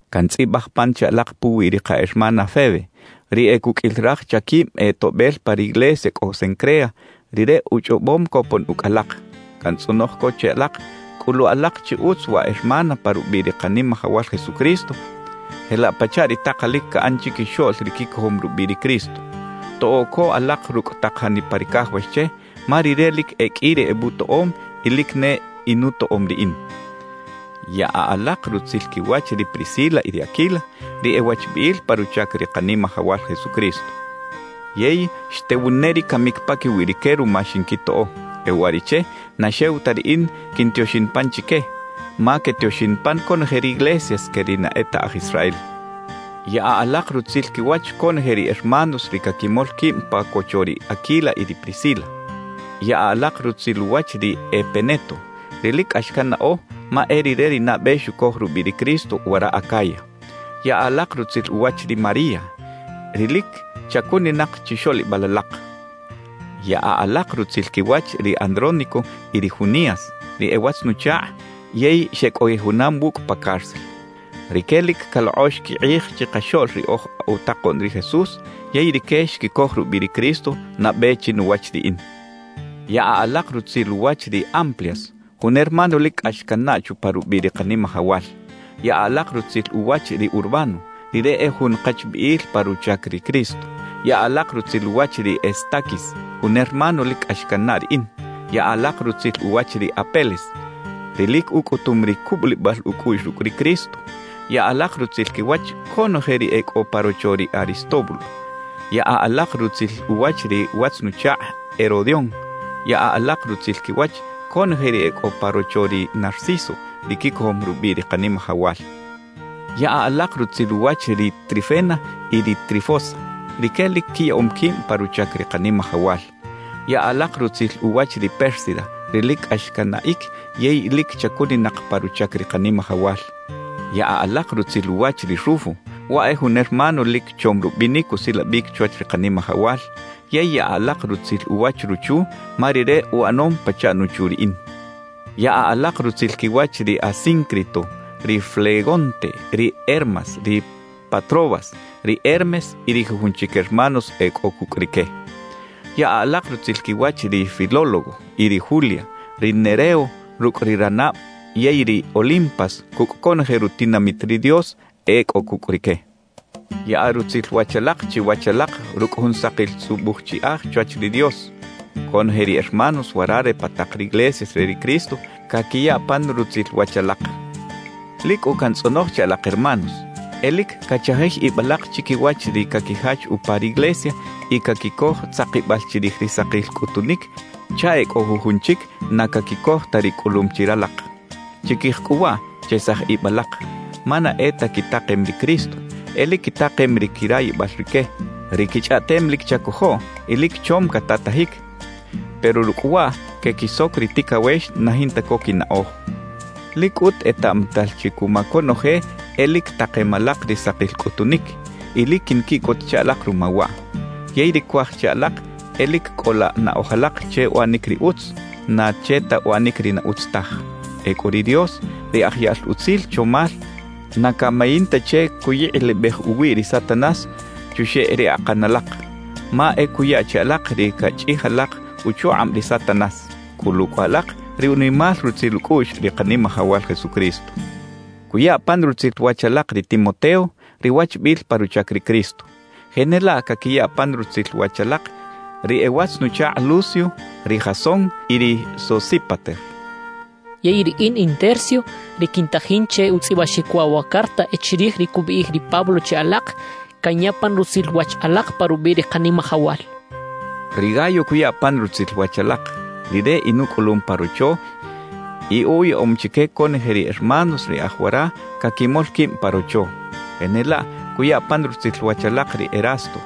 Kantzꞌibꞌaj pan che alaq puwi ri qa hermana Febe, ri e kukꞌil raj chakibꞌ e toꞌbꞌel pa riglesia kꞌo Cencrea; rire uchꞌobꞌom kopon ukꞌ alaq. Kantzꞌonoj ko che alaq, kꞌulu alaq chi utz wa hermana pa rubꞌiꞌ ri Qanimajawal Jesucristo jelaꞌ pachaꞌ ri taqalik kaꞌan chikixoꞌl ri kikojom rubꞌiꞌ ri Cristo. Toꞌo ko alaq rukꞌ taq janipa ri kajawax che, ma rire lik e kꞌi ri ebꞌutoꞌom y lik ne inutoꞌom riꞌin. Yaꞌa alaq rutzil kiwach ri Priscila y ri Aquila, ri e wachbꞌiꞌil pa ruchak ri Qanimajawal Jesucristo. Yey xtewun ne ri kamik pakiwi rike ruma xinkitoꞌo. E uwariꞌche, na xew ta riꞌin kintioxin pan chike, ma ketioxin pan konoje riglesias ke ri na e ta aj Israel. Yaꞌa alaq rutzil kiwach konoje ri hermanos ri kakimol kibꞌ pa kocho ri Aquila y ri Priscila. Yaꞌa alaq rutzil uwach ri Epeneto, ri lik kꞌax kannaꞌo, ma e rire ri nabꞌe xukoj rubꞌiꞌ ri Cristo wara Acaya. Yaꞌa alaq rutzil uwach ri María, ri lik chakuninaq chixoꞌlibꞌal alaq. Yaꞌa alaq rutzil kiwach ri Andrónico y ri Junias; ri e watz-nuchaqꞌ yey xekꞌojiꞌ junam wukꞌ pa cárcel. Rike lik kaloqꞌox kiqꞌij chiqaxoꞌl ri oj utaqoꞌn ri Jesús, yey rike xkikoj rubꞌiꞌ ri Cristo nabꞌe chinuwach riꞌin. Yaꞌa alaq rutzil uwach ri Amplias, jun hermano lik kꞌax kannaꞌ chupa rubꞌiꞌ ri Qanimajawal. Yaꞌa alaq rutzil uwach ri Urbano; rire e jun qachbꞌiꞌil pa ruchak ri Cristo. Yaꞌa alaq rutzil uwach ri Estaquis, jun hermano lik kꞌax kannaꞌ riꞌin. Yaꞌa alaq rutzil uwach ri Apeles, ri lik ukꞌutum ri kubꞌulibꞌal ukꞌuꞌx rukꞌ ri Cristo. Yaꞌa alaq rutzil kiwach konoje ri e kꞌo pa rocho ri Aristóbulo. Yaꞌa alaq rutzil uwach ri watz-nuchaqꞌ Herodión. Yaꞌa alaq rutzil kiwach konoje ri e kꞌo pa rocho ri Narciso, ri kikojom rubꞌiꞌ ri Qanimajawal. Yaꞌa alaq rutzil uwach ri Trifena y ri Trifosa; rike lik kiyaꞌom kibꞌ pa ruchak ri Qanimajawal. Yaꞌa alaq rutzil uwach ri Pérsida, ri lik kꞌax kanaꞌik yey lik chakuninaq pa ruchak ri Qanimajawal. Yaꞌa alaq rutzil uwach ri Rufo; waꞌ e jun hermano lik chom rubꞌinik usilabꞌik chwach ri Qanimajawal. Yey yaꞌa alaq rutzil uwach ruchu, ma rire uꞌanom pachaꞌ nuchu riꞌin. Yaꞌa alaq rutzil kiwach ri Asíncrito, ri Flegonte, ri Hermas, ri Patrobas, ri Hermes y ri jujun chik hermanos e kꞌo kukꞌ rike. Yaꞌa alaq rutzil kiwach ri Filólogo y ri Julia, ri Nereo rukꞌ ri ranabꞌ yey ri Olimpas kukꞌ konoje rutinamit ri Dios e kꞌo kukꞌ rike. Yaꞌa rutzil wach alaq chiwach alaq rukꞌ jun saqil tzꞌubꞌuj chiꞌaj chwach ri Dios. Konoje ri hermanos wara re pa taq riglesias re ri Cristo kakiya pan rutzil wach alaq. Lik kꞌu kantzꞌonoj che alaq hermanos, e lik kachajij ibꞌ alaq chikiwach ri kakijach upa riglesia y kakikoj tzaqibꞌal chirij ri saqil kꞌutunik chaꞌ e kꞌo jujun chik na kakikoj ta ri kꞌulum chi ralaq. Chikij kꞌu waꞌ, chesaj ibꞌ alaq; ma na e ta kitaqem ri Cristo, e lik kitaqem ri kirayibꞌal rike. Ri kichꞌaꞌtem lik chakojoꞌ y lik chom katatajik, pero rukꞌ waꞌ kekisok ri tikawex na jinta ko kinaꞌoj. Lik kꞌut etaꞌmatal chi kuma konoje e lik taqem alaq ri saqil kꞌutunik, y lik kinkiꞌkot che alaq ruma waꞌ. Yey ri kuaj che alaq e lik kꞌola naꞌoj alaq che uꞌanik ri utz, na che ta uꞌanik ri na utz taj. Ekꞌu ri Dios, ri aj yaꞌl utzil chomal, na kamayin ta che kuyiqꞌilibꞌej uwiꞌ ri Satanás chuxeꞌ ri aqan alaq; ma e kuya che alaq ri kachꞌij alaq uchuqꞌabꞌ ri Satanás. Kꞌulu kꞌu alaq ri unimal rutzil ukꞌuꞌx ri Qanimajawal Jesucristo. Kuya pan rutzil wach alaq ri Timoteo, ri wachbꞌiꞌil pa ruchak ri Cristo. Jenelaꞌ kakiya pan rutzil wach alaq ri e watz-nuchaqꞌ Lucio, ri Jasón y ri Sosípater. Yey riꞌin in Tercio, ri kintajin che utzꞌibꞌaxik waꞌ wa carta e chirij ri kubꞌiꞌij ri Pablo che alaq, kanya pan rutzil wach alaq pa rubꞌiꞌ ri Qanimajawal. Ri Gayo kuya pan rutzil wach alaq; rire inukꞌulum pa rocho y uyaꞌom chike konoje ri hermanos ri e aj wara kakimol kibꞌ pa rocho. Jenelaꞌ kuya pan rutzil wach alaq ri Erasto,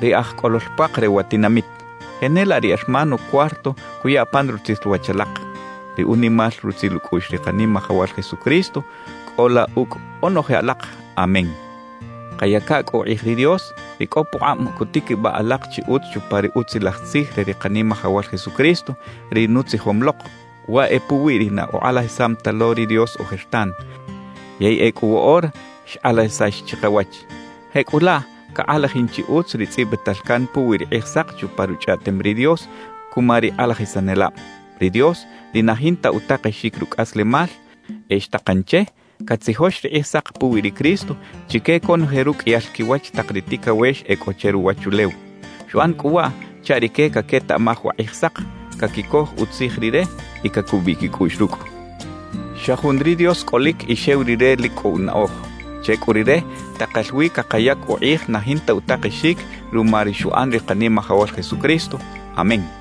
ri aj kꞌolol puaq re wa tinamit; jenelaꞌ ri hermano Cuarto kuya pan rutzil wach alaq. Ri unimal rutzil ukꞌuꞌx ri Qanimajawal Jesucristo kꞌola ukꞌ onoje alaq. Amén. Qayaka kꞌu uqꞌij ri Dios, ri kꞌo puqꞌabꞌ kutikibꞌaꞌ alaq chi utz chupa ri Utzilaj Tzij re ri Qanimajawal Jesucristo, ri nutzijom loq. Waꞌ e puwi ri na uqꞌalajisam ta lo ri Dios ojertan, yey ekꞌu woꞌora xqꞌalajisax chiqawach. Jekꞌulaꞌ kaqꞌalajin chi utz ri tzꞌibꞌital kan puwi ri Qꞌijsaq chupa Ruchꞌaꞌtem ri Dios kuma ri qꞌalajisanelabꞌ. Ri Dios, ri na jinta utaqexik rukꞌaslemal, e xtaqan che katzijox ri Qꞌijsaq puwi ri Cristo chike konoje rukꞌiyal kiwach taq ri tikawex e kꞌo che ruwachulew. Xuꞌan kꞌu waꞌ chaꞌ rike kaketaꞌmaj wa Qꞌijsaq, kakikoj utzij Rire y kakubꞌiꞌ kikꞌuꞌx rukꞌ. Xa jun ri Dios kꞌolik y xew Rire lik kꞌo unaꞌoj. Che kꞌu Rire taqal wi kaqayak uqꞌij na jinta utaqexik ruma ri xuꞌan ri Qanimajawal Jesucristo. Amén.